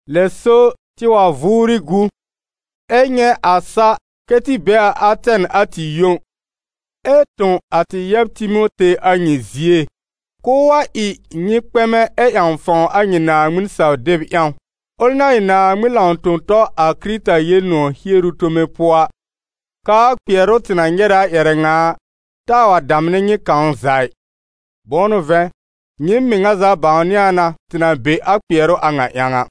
Lɛ so, tɩ wa vʋʋrɩ gu, ɛ nyɛ̃ a sa kɛ́ tɩ be a Atɛn a tɩ yõ, ɛ tõ a tɩ yɛb Timote a nyɩ zie, k'ʋʋ wa ɩ nyɩ kpɛmɛ ɛ ƴãw fãw a nyɩ Naaŋmɩn saw-deb ƴãw, ʋl na ɩ Naaŋmɩn lãw-tõ-tɔ a Kɩrɩta Yel-nʋ̃ɔ̀ hieru tome pʋɔ a, k'aa kpɩɛrʋ tɩ na nyɛrɛ a ƴɛrɛ ŋa a, taa wa damnɛ nyɩ kãw za ɩ. Bʋ̃ʋ n'ʋ vɛ̃, nyɩɩm mɩŋa za bãwnɩ a na tɩ na be a kpɩɛrʋ a ŋa ƴãw a.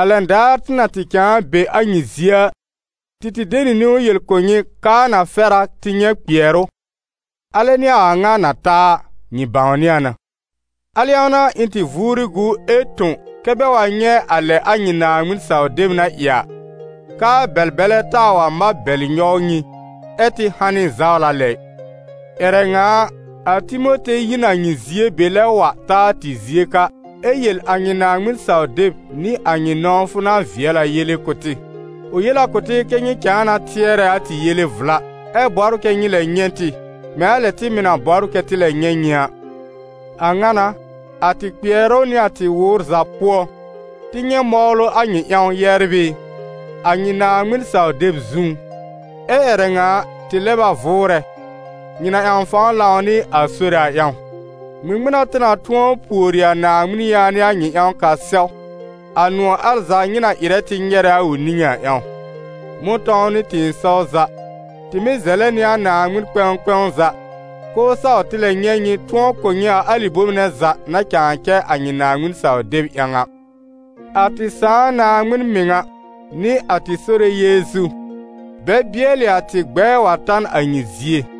A lɛn daar tɩ na tɩ cãa be a nyɩ zie a, tɩ tɩ de niwn yel kʋ̀ nyɩ k'aa na fɛr a tɩ nyɛ̃ kpɩɛrʋ, alɛ n'ɩ a a ŋa na ta a, nyɩ bãwnɩ a na. Al ƴãw n'a, ɩ̃ tɩ vʋʋrɩ gu ɛ tõ kɛ́ bɛ wa nyɛ̃ a lɛ a nyɩ Naaŋmɩn saw-deb na ɩ a, k'aa Bɛl-bɛlɛ taa wa mab bɛlɩ nyɔw nyɩ, ɛ́ tɩ hanɩ zawla lɛ ɩ. Ƴɛrɛ ŋa a, a Timote yi n a nyɩ zie be lɛb wa ta a tɩ zie ka, ɛ yel a nyɩ Naaŋmɩn-saw-deb nɩ a nyɩ nɔ̃wfʋ na vɩɛl a yele kʋ̀ tɩ. Ʋ yel a kʋ̀ tɩ kɛ́ nyɩ cãa na tɩɛrɛ a tɩ yele vla, ɛ bɔbr kɛ nyɩ lɛb nyɛ̃ tɩ, mɛ̃ a lɛ tɩ mɩ̀ na bɔbr kɛ́ tɩ lɛb nyɛ̃ nyɩ a. A ŋa n'a, a tɩ kpɩɛrʋ nɩ a tɩ wʋʋr za pʋɔ, tɩ nyɛ̃ mɔwlʋ a nyɩ ƴãw, yɛbr ɩ, a nyɩ Naaŋmɩn saw-deb zũú. Ɛ́ ƴɛrɛ ŋa a, tɩ lɛb a vʋʋrɛ, nyɩ na ƴãw fãw lãw nɩ a Sore a ƴãw. Ŋmɩŋmɩn n'a tɩ na tʋ̃ɔ pùori a Naaŋmɩn yaanɩ a nyɩ ƴãw k'a sɛw, a nʋ̃ɔ̀ al za nyɩ na ɩrɛ tɩ nyɛrɛ a ʋ niŋé a ƴãw? Mʋ̃tɔ̃w nɩ tɩ̃ɩsɔw za, tɩ mɩ́ zɛlɛ nɩ a Naaŋmɩn kpɛ̃w kpɛ̃w za, k'ʋʋ saw tɩ lɛb nyɛ̃ nyɩ tʋ̃ɔ kʋ̀ nyɩ a alɩ bome nɛ za na cãa cɛ a nyɩ Naaŋmɩn-saw-deb ƴãw a. A tɩ Sãà Naaŋmɩn mɩŋa, nɩ a tɩ Sore Yeezu, bɛ bɩɛlɩ a tɩ gbɛɛ wa ta n a nyɩ zie.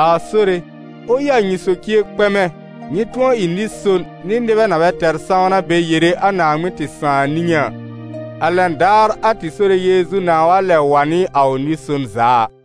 A Sore, ʋ ɩ a nyɩ socie kpɛmɛ, nyɩ tʋ̃ɔ ɩ nɩ-son nɩ nɩbɛ na bɛ tɛr sãwna bɛ yere a Naaŋmɩn tɩ Sãà niŋé a, a lɛn daar a tɩ Sore Yeezu nãa wa lɛb wa nɩ a ʋ nɩ-son za a ɩ.